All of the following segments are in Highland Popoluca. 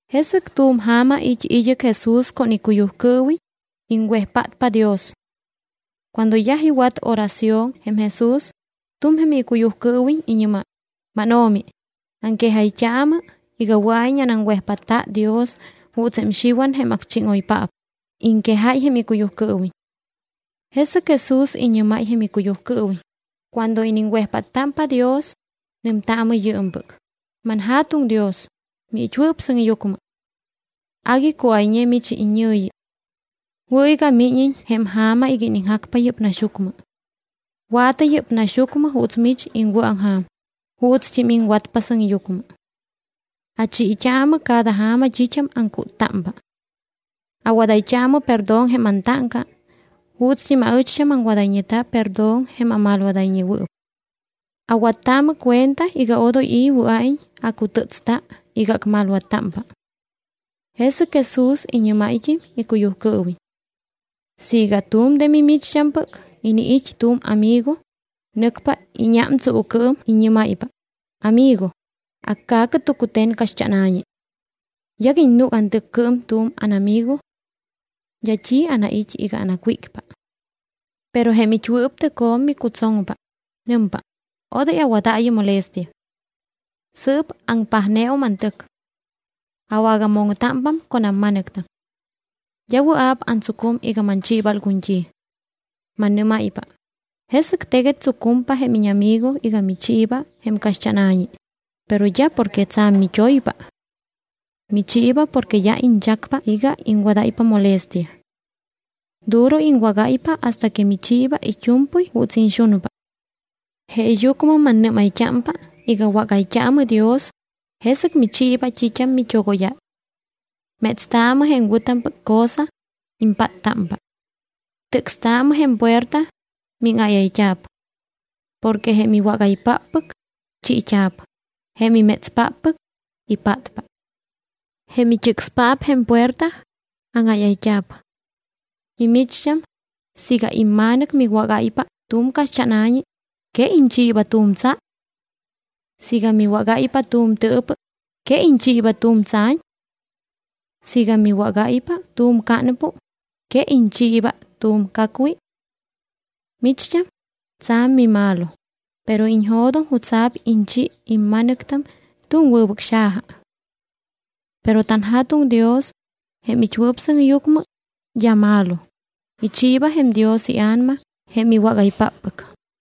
Jesɨc tu̱m ja̱ma it́ id́ɨc Jesús con icuyujcɨɨwiñ, iŋwejpátpa Dios. Cuando yaj iwat oración jém Jesús, tu̱m jém icuyujcɨɨwiñ iñɨ́máy: —MánO̱mi, aŋquejayt́aamɨ iga wɨa̱iñ anaŋwejpátta Dios juuts jém Xiwan, jém acchíŋoypaap, iŋquejáy jém icuyujcɨɨwiñ. Jesɨc Jesús iñɨ́máy jém icuyujcɨɨwiñ: —Cuando iniŋwejpáttámpa Dios, nɨmtaamɨ yɨɨmpɨc: ManJa̱tuŋ Dios, miit́wɨɨp sɨŋyucmɨ. Agui cuáyñe mich iñɨ̱yi. Wɨ̱ iga míñiñ jém ja̱ma iga iniŋjacpa yɨ́p naxyucmɨ. Wa̱tɨ yɨ́p naxyucmɨ juuts mich iŋwɨ̱aŋja̱m, juutst́im iŋwatpa sɨŋyucmɨ. Achiit́aamɨ cada ja̱ma t́it́am aŋcúttámpa. Awadayt́aamɨ perdón jém antáŋca juutst́im aɨcht́am aŋwadayñeta perdón jém amalwadayñewɨɨp. Awattaamɨ cuenta iga odoy i̱ wɨa̱iñ acutɨ́tsta iga acmalwattámpa. Jesɨc Jesús iñɨ́máyt́im icuyujcɨɨwiñ: —Siiga tu̱m de mimicht́ampɨc iniit́ tu̱m amigo, nɨcpa íñám tsuucɨɨm, iññɨ́máypa: “Amigo, acca̱cɨ tucute̱n caxt́ána̱ñi. Yaguiñ núc antɨccɨɨm tu̱m ánamigo. D́a t́i anait́ iga anacwícpa.” Pero jém it́wɨɨp tɨcjo̱m micutsoŋpa, nɨmpa: “Odoy awadaayɨ molestia. Sɨɨp aŋpajneum antɨc. Awagamoŋtámpa con amma̱nɨctam. D́a wɨa̱p antsucum iga manchiiba algun t́i.” Mannɨ́máypa, jesɨc teguet tsucumpa jém íñamigo iga michiiba jém caxt́ána̱ñi. Pero d́a porque tsa̱m mit́oypa. Michiiba porque d́a iñchacpa iga iŋwadáypa molestia. Duro iŋwágáypa hasta que michiiba it́u̱mpɨy juuts iñxunpa. Jeeyucmɨm annɨ́mayt́ámpa iga wágayt́aamɨ Dios, jesɨc michiiba t́it́am mit́ogóyáy. Métstaamɨ jém wɨ̱tampɨc cosa, impáttámpa. Tɨcstaamɨ jém puerta, míŋáyayt́a̱p. Porque jém iwágaypáppɨc, chiit́a̱p. Jém imétspáppɨc, ipátpa. Jém it́ɨcspaap jém puerta, áŋáyayt́a̱p. ’Mimicht́am, siiga imma̱nɨc miwágáypa tu̱m caxt́ána̱ñi, ¿que iñchiiba tu̱m tsa? Siiga miwágáypa tu̱m tɨɨpɨ, ¿que iñchiiba tu̱m tsa̱ñ? Siiga miwágáypa tu̱m cánpu, ¿que iñchiiba tu̱m cacwi? Micht́am, tsa̱m mimalo, pero iñjo̱doŋ jutsa̱p iñchi imma̱nɨctam tu̱m wɨbɨc xaja. Pero tanJa̱tuŋ Dios, jém it́wɨɨp sɨŋyucmɨ, d́a malo; ichiiba jém Dios iA̱nama jém iwágaypáppɨc.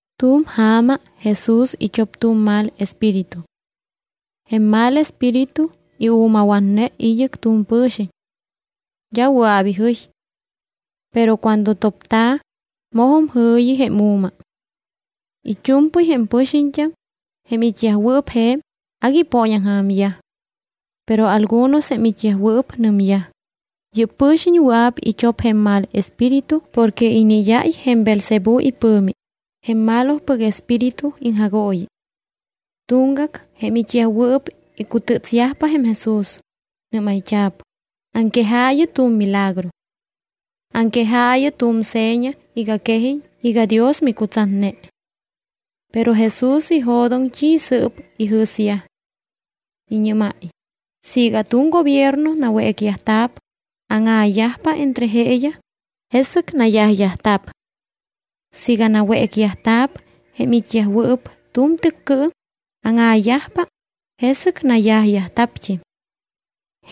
Tu̱m ja̱ma Jesús it́op tu̱m mal espíritu. Jém mal espíritu iu̱mawatne id́ɨc tu̱m pɨ̱xiñ. D́a wɨa̱p ijɨy. Pero cuando topta̱, mojum jɨ̱yi jém u̱ma. It́u̱mpɨy jém pɨxiñt́am, jém it́yajwɨɨp je̱m, agui ipooñaŋja̱myaj. Pero algunos jém it́yajwɨɨp nɨmyaj: —Yɨ́p pɨ̱xiñ wɨa̱p it́op jém mal espíritu porque iniid́áy jém Beelzebú ipɨ̱mi, jém malopɨc espíritu iŋjagooyi. Tuŋgac jém it́yajwɨɨp icutɨtsyajpa jém Jesús. Nɨ́mayt́a̱p: —Aŋquejaayɨ tu̱m milagro. Aŋquejaayɨ tu̱m seña iga quejiñ iga Dios micutsatne. Pero Jesús ijo̱doŋ t́i sɨ́p ijɨ̱syaj. Iñɨ́máy: —Siiga tu̱m gobierno nawécyajta̱p, áŋa̱yajpa entre jeeyaj, jesɨc nayajyajta̱p. Siiga nawécyajta̱p jém it́yajwɨɨp tu̱m tɨccɨɨm, áŋa̱yajpa, jesɨc nayajyajta̱pt́im.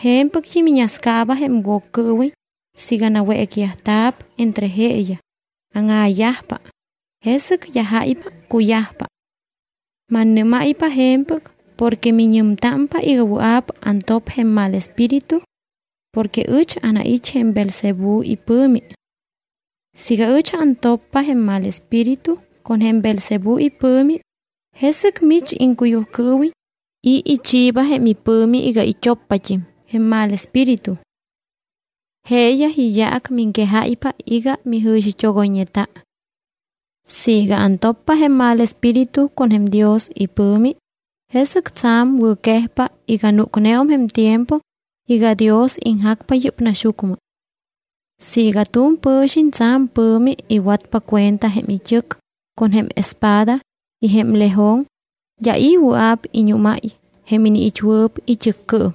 Je̱mpɨct́im iñascaaba jém Woccɨɨwiñ siiga nawécyajta̱p entre jeeyaj, áŋa̱yajpa, jesɨc d́a jáypa cuyajpa. Mannɨ́máypa je̱mpɨc porque miñɨmtámpa iga wɨa̱p antop jém mal espíritu porque ɨch anait́ jém Beelzebú ipɨ̱mi. Siiga ɨch antoppa jém mal espíritu con jém Beelzebú ipɨ̱mi, ¿jesɨc mich iŋcuyujcɨɨwiñ, i̱ ichiiba jém ipɨ̱mi iga it́oppat́im jém mal espíritu? Jeeyaj iyaac miŋquejáypa iga mijɨ̱xit́ogoyñeta. Siiga antoppa jém mal espíritu con jém Dios ipɨ̱mi, jesɨc tsa̱m wɨ̱quejpa iga núcneum jém tiempo iga Dios iŋjacpa yɨ́p naxyucmɨ. ’Siiga tu̱m pɨ̱xiñ tsa̱m pɨ̱mi iwatpa cuenta jém it́ɨc con jém espada y jém lejon, d́a i̱ wɨa̱p iñúmáy jém iniit́wɨɨp it́ɨccɨɨm.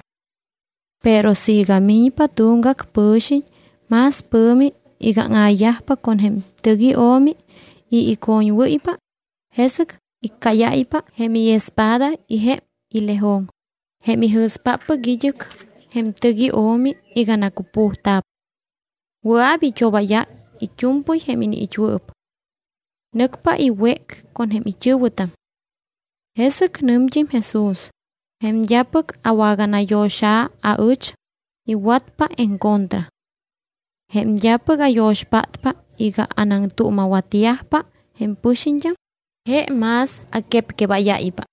Pero siiga miñpa tuŋgac pɨ̱xiñ más pɨ̱mi iga áŋa̱yajpa con jém tɨc io̱mi y icoñwɨ́ypa, jesɨc iccáyáypa jém iespada y jém ilejon, jém ijɨ̱spáppɨc id́ɨc jém tɨc io̱mi iga nacupujta̱p. Wɨa̱p it́obáyáy it́u̱mpɨy jém iniit́wɨɨp. Nɨcpa iwéc con jém it́ɨ̱wɨtam. Jesɨc nɨmt́im Jesús: —Jém d́apɨc awaganayo̱xa̱ aɨch, iwatpa en contra. Jém d́apɨc ayo̱xpátpa iga anaŋtuuma̱watyajpa jém pɨxiñt́am, je más aquepquebáyáypa.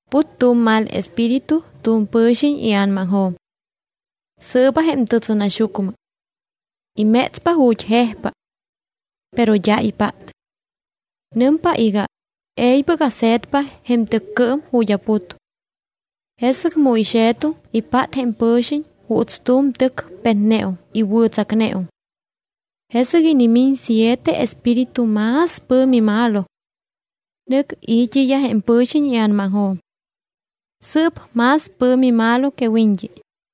’Put tu̱m mal espíritu tu̱m pɨ̱xiñ ia̱namaŋjo̱m. Sɨɨba jém tɨtsɨnaxyucmɨ. Imétspa ju̱t́ jejpa. Pero d́a ipát. Nɨmpa iga: “E̱ybɨc ase̱tpa jém tɨccɨɨm ju̱t́ aput.” Jesɨc mu ixe̱tum, ipát jém pɨ̱xiñ juuts tu̱m tɨc petneum y wɨ̱tsacneum. Jesɨc inimiñ siete espíritu más pɨ̱mi malo. Nɨc i̱t́iyaj jém pɨ̱xiñ ia̱namaŋjo̱m. Sɨɨp más pɨ̱mi malo que wiñt́i.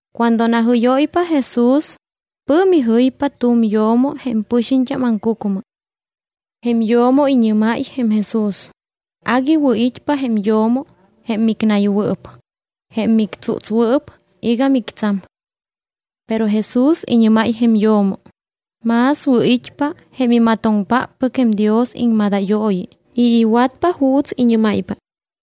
Cuando najɨ́yóypa Jesús, pɨ̱mi jɨypa tu̱m yo̱mo jém pɨxiñt́am aŋcucmɨ. Jém yo̱mo iñɨ́máy jém Jesús: —Agui wɨ̱it́pa jém yo̱mo jém micnaywɨɨp, jém mictsútswɨɨp iga mictsam. Pero Jesús iñɨ́máy jém yo̱mo: —Más wɨ̱it́pa jém imatoŋpáppɨc jém Dios iŋmadayooyi y iwatpa juuts iñɨ́máypa.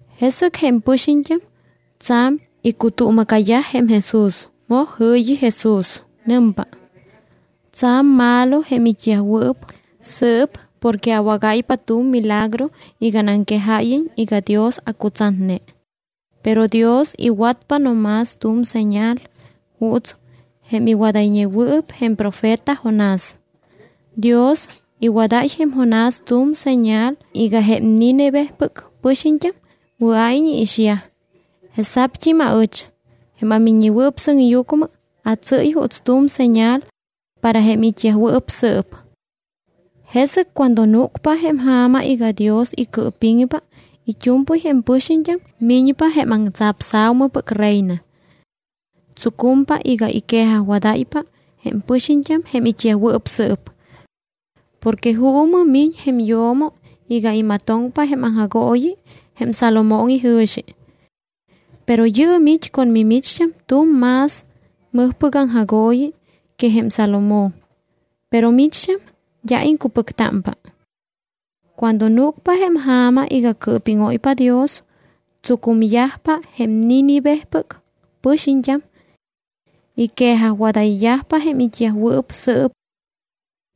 Jesɨc jém pɨxiñt́am tsa̱m icutuuma̱cayaj jém Jesús. Moj jɨ̱yi Jesús. Nɨmpa: —Tsa̱m malo jém it́yajwɨɨp sɨɨp porque awágáypa tu̱m milagro iga anaŋquejáyiñ iga Dios acutsatne. Pero Dios iwatpa no más tu̱m señal juuts jém iwadayñewɨɨp jém profeta Jonás. Dios iwadáy jém Jonás tu̱m señal iga jém Nínivepɨc pɨxiñt́am wɨa̱iñ iixyaj. Jesa̱pt́im aɨch jém aMiññewɨɨp Sɨŋyucmɨ atsɨ́y juuts tu̱m señal para jém it́yajwɨɨp sɨɨp. Jesɨc cuando núcpa jém ja̱ma iga Dios icɨɨpiŋpa it́u̱mpɨy jém pɨxiñt́am, miñpa jém aŋtsapsa̱umɨpɨc reina. Tsucumpa iga iquejajwadáypa jém pɨxiñt́am jém it́yajwɨɨp sɨɨp. Porque juumɨ miñ jém yo̱mo iga imatoŋpa jém aŋjagooyi jém Salomón ijɨ̱xi. Pero yɨɨm it́ con mimicht́am tu̱m más mɨjpɨc aŋjagooyi que jém Salomón, pero micht́am d́a iŋcupɨctámpa. Cuando núcpa jém ja̱ma iga cɨɨpíŋóypa Dios, tsucumyajpa jém Nínivepɨc pɨxiñt́am. Iquejajwadayyajpa jém it́yajwɨɨp sɨɨp.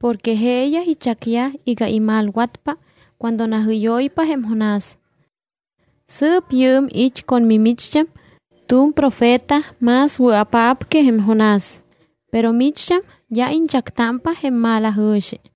Porque jeeyaj ichacyaj iga imalwatpa cuando najɨ́yóypa jém Jonás. Sɨɨp yɨɨm it́ con mimicht́am tu̱m profeta más wɨa̱paap que jém Jonás, pero micht́am d́a iñchactámpa jém malajɨ̱xi.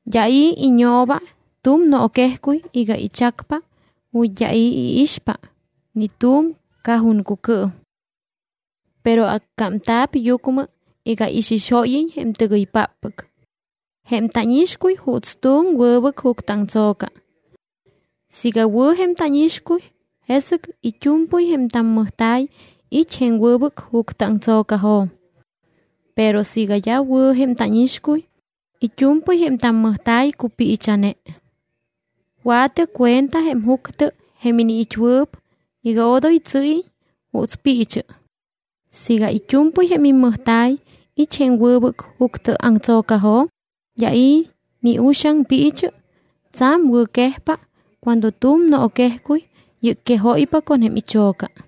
’D́a i̱ iñooba tu̱m nooquejcuy iga ichacpa ju̱t́ d́a i̱ iixpa ni tu̱m cajoncucɨɨm. Pero accámta̱p yucmɨ iga ixixóyiñ jém tɨgɨypáppɨc. Jém tánixcuy juuts tu̱m wɨbɨc juctɨ aŋtso̱ca. Siiga wɨ̱ jém tánixcuy, jesɨc it́u̱mpɨy jém tammɨjta̱y it́ jém wɨbɨc juctɨ aŋtso̱cajo̱m. Pero siiga d́a wɨ̱ jém tánixcuy, it́u̱mpɨy jém tammɨjta̱y cupiicha̱ne. Wa̱tɨ cuenta jém juctɨ jém iniit́wɨɨp iga odoy tsɨɨyiñ juuts piichɨ. Siiga it́u̱mpɨy jém immɨjta̱y it́ jém wɨbɨc juctɨ aŋtso̱cajo̱m, d́a i̱ ni uxaŋ piichɨ, tsa̱m wɨ̱quejpa cuando tu̱m nooquejcuy yɨcquejóypa con jém icho̱ca.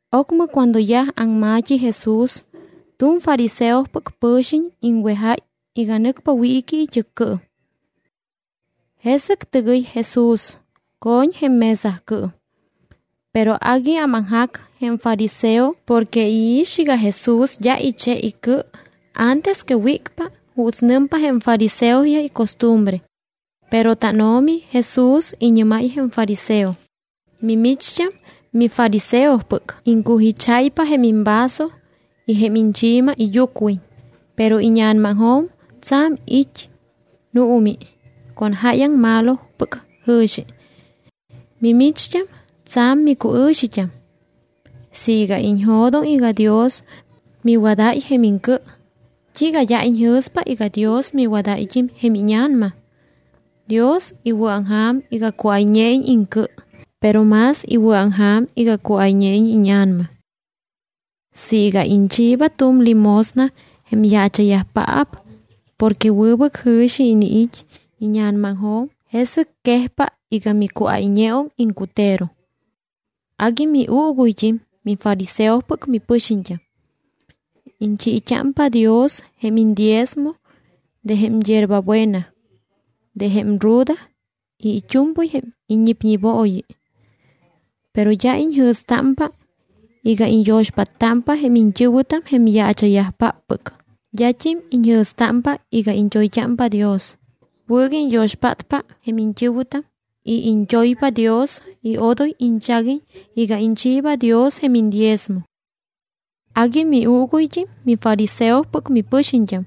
Ocmɨ cuando yaj aŋma̱t́i Jesús, tu̱m fariseopɨc pɨ̱xiñ iŋwejáy iga nɨcpa wiiqui it́ɨccɨɨm. Jesɨc tɨgɨy Jesús, co̱ñ jém mesacɨɨm. Pero agui ámaŋjac jém fariseo porque iix iga Jesús d́a iche icɨ antes que wícpa juuts nɨmpa jém fariseoyaj icostumbre. Pero tánO̱mi Jesús iñɨ́máy jém fariseo: —Mimicht́am mifariseopɨc, iŋcujicháypa jém imvaso y jém iñchi̱ma iyucwiñ, pero íña̱namaŋjo̱m tsa̱m it́ nuumi con jáyaŋ malopɨc jɨ̱xi. Mimicht́am, tsa̱m micuɨ̱xit́am. Siiga iñjo̱doŋ iga Dios miwadáy jém iŋcɨ, ¿t́iiga d́a iñjɨ̱spa iga Dios miwadáyt́im jém íña̱nama? Dios iwɨ̱aŋja̱m iga cuáyñeiñ iŋcɨ, pero más iwɨ̱aŋja̱m iga cuáyñeiñ íña̱nama. Siiga iñchiiba tu̱m limosna jém yaacha̱yajpaap porque wɨbɨc jɨ̱xi iniit́ íña̱namaŋjo̱m, jesɨc quejpa iga micuáyñeum iŋcutero. ’Agui miuuguyt́im mifariseopɨc mipɨxiñt́am. Iñchiit́ámpa Dios jém iñdiezmo de jém yierba buena, de jém ruda y it́u̱mpɨy jém iññipñibooyi. Pero d́a iñjɨ̱stámpa iga iñyo̱xpáttámpa jém iñt́ɨ̱wɨtam jém yaacha̱yajpáppɨc. D́at́im iñjɨ̱stámpa iga iñt́oyt́ámpa Dios. Wɨ̱ iga iñyo̱xpátpa jém iñt́ɨ̱wɨtam y iñt́oypa Dios y odoy iñchaguiñ iga iñchiiba Dios jém iñdiezmo. ’Agui miuuguyt́im, mifariseopɨc mipɨxiñt́am,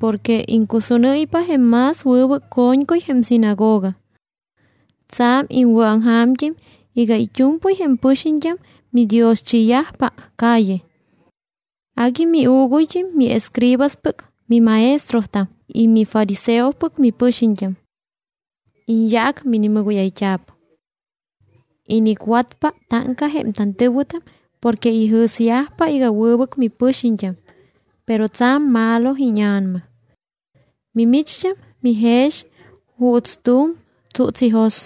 porque iŋcusúnɨ́ypa jém más wɨbɨc co̱ñcuy jém sinagoga. Tsa̱m iŋwɨ̱aŋja̱mt́im iga it́u̱mpɨy jém pɨxiñt́am midioschiiyajpa calle. ’Agui miuuguyt́im miescribaspɨc mimaestrotam y mifariseopɨc mipɨxiñt́am. Iñyaac minimɨgóyayt́a̱p. Inicwatpa táŋca jém tantɨ̱wɨtam porque ijɨ̱syajpa iga wɨbɨc mipɨxiñt́am, pero tsa̱m malo íña̱nama. Mimicht́am mijex juuts tu̱m tsúts ijos.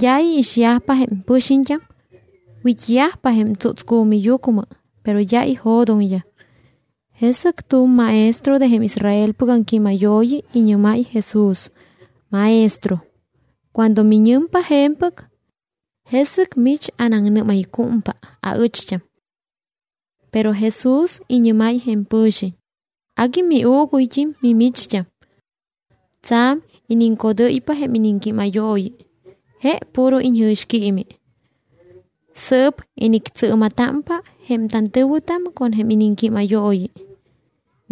D́a iixyajpa jém pɨxiñt́am, wit́yajpa jém tsútscu̱miyucmɨ, pero d́a ijo̱doŋyaj. Jesɨc tu̱m maestro de jém Israelpɨc aŋquímayooyi iñɨ́máy Jesús: —Maestro, cuando miñɨmpa je̱mpɨc, jesɨc mich anaŋnɨ́maycúmpa aɨcht́am. Pero Jesús iñɨ́máy jém pɨ̱xiñ: —Agui miuuguyt́im mimicht́am. Tsa̱m iniŋcodɨ́ypa jém iniŋquímayooyi, je puro iñjɨ̱xquiimi. Sɨɨp inictsɨɨma̱támpa jém tantɨ̱wɨtam con jém iniŋquímayooyi.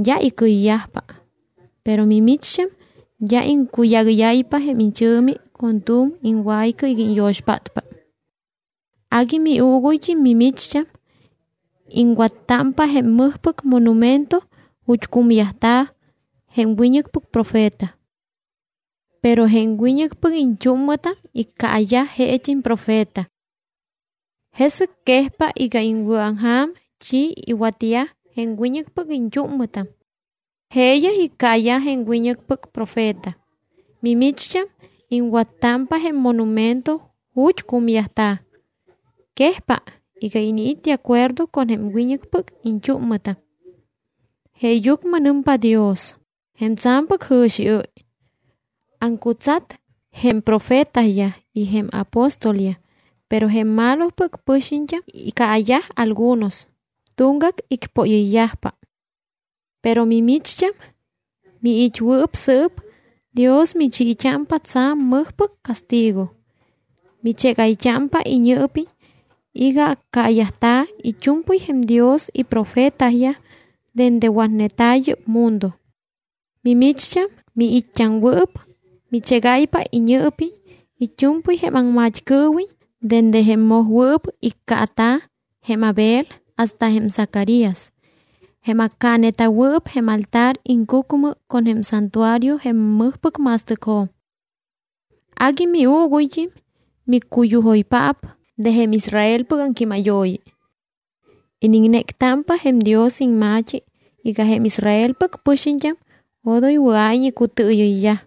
D́a icɨyyajpa. Pero mimicht́am d́a iŋcuyágɨ́yáypa jém ichɨ̱mi con tu̱m iŋwaycɨ iga iñyo̱xpátpa. ’Agui miuuguyt́im mimicht́am, iŋwattámpa jém mɨjpɨc monumento ju̱t́ cumyajta̱ jém wiñɨcpɨc profeta. Pero jém wiñɨcpɨc iñt́úmmɨtam iccaayaj jeet́im profeta. Jesɨc quejpa iga iŋwɨ̱aŋja̱m t́i iwatyaj jém wiñɨcpɨc iñt́úmmɨtam. Jeeyaj iccaayaj jém wiñɨcpɨc profeta, mimicht́am iŋwattámpa jém monumento ju̱t́ cumyajta̱. Quejpa iga iniit́ de acuerdo con jém wiñɨcpɨc iñt́úmmɨtam. ’Jeeyucmɨ nɨmpa Dios, jém tsa̱mpɨc jɨ̱xiɨ́y: “Aŋcutsat jém profetayaj y jém apóstolyaj, pero jém malopɨc pɨxiñt́am iccaayaj algunos, tuŋgac icpóyɨyyajpa.” Pero mimicht́am, miit́wɨɨp sɨɨp, Dios michiit́ámpa tsa̱m mɨjpɨc castigo. Michégayt́ámpa iñɨɨpiñ iga accaayajta̱ it́u̱mpɨy jém Dios iprofetayaj dende watneta̱ yɨ́p mundo. Mimicht́am, miit́t́aŋwɨɨp, michégáypa iñɨɨpiñ it́u̱mpɨy jém aŋmat́cɨɨwiñ dende jém mojwɨɨp iccaata̱, jém Abel, hasta jém Zacarías, jém accaaneta̱wɨɨp jém altar iŋcucmɨ con jém santuario jém mɨjpɨc ma̱stɨcjo̱m. ’Agui miuuguyt́im miccuyujoypaap de jém Israelpɨc aŋquímayooyi. Iniŋnéctámpa jém Dios iŋma̱t́i iga jém Israelpɨc pɨxiñt́am odoy wɨa̱iñ icutɨɨyɨyyaj.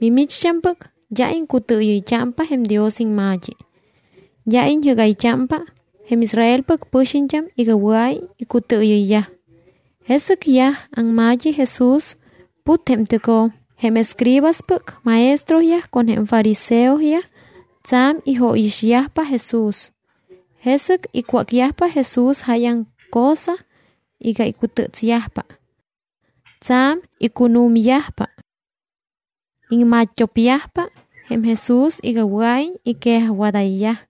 Mimicht́ampɨc d́a iŋcutɨɨyɨyt́ámpa jém Dios iŋma̱t́i, d́a iñjɨ́gayt́ámpa jém Israelpɨc pɨxiñt́am iga wɨa̱iñ icutɨɨyɨyyaj. Jesɨc yaj aŋma̱t́i Jesús. Put jém tɨcjo̱m. Jém escribaspɨc maestroyaj con jém fariseoyaj tsa̱m ijóyixyajpa Jesús. Jesɨc icwácyajpa Jesús jáyaŋ cosa iga icutɨtsyajpa. Tsa̱m icunu̱myajpa. Iŋma̱t́t́o̱pyajpa jém Jesús iga wɨa̱iñ iquejajwadayyaj.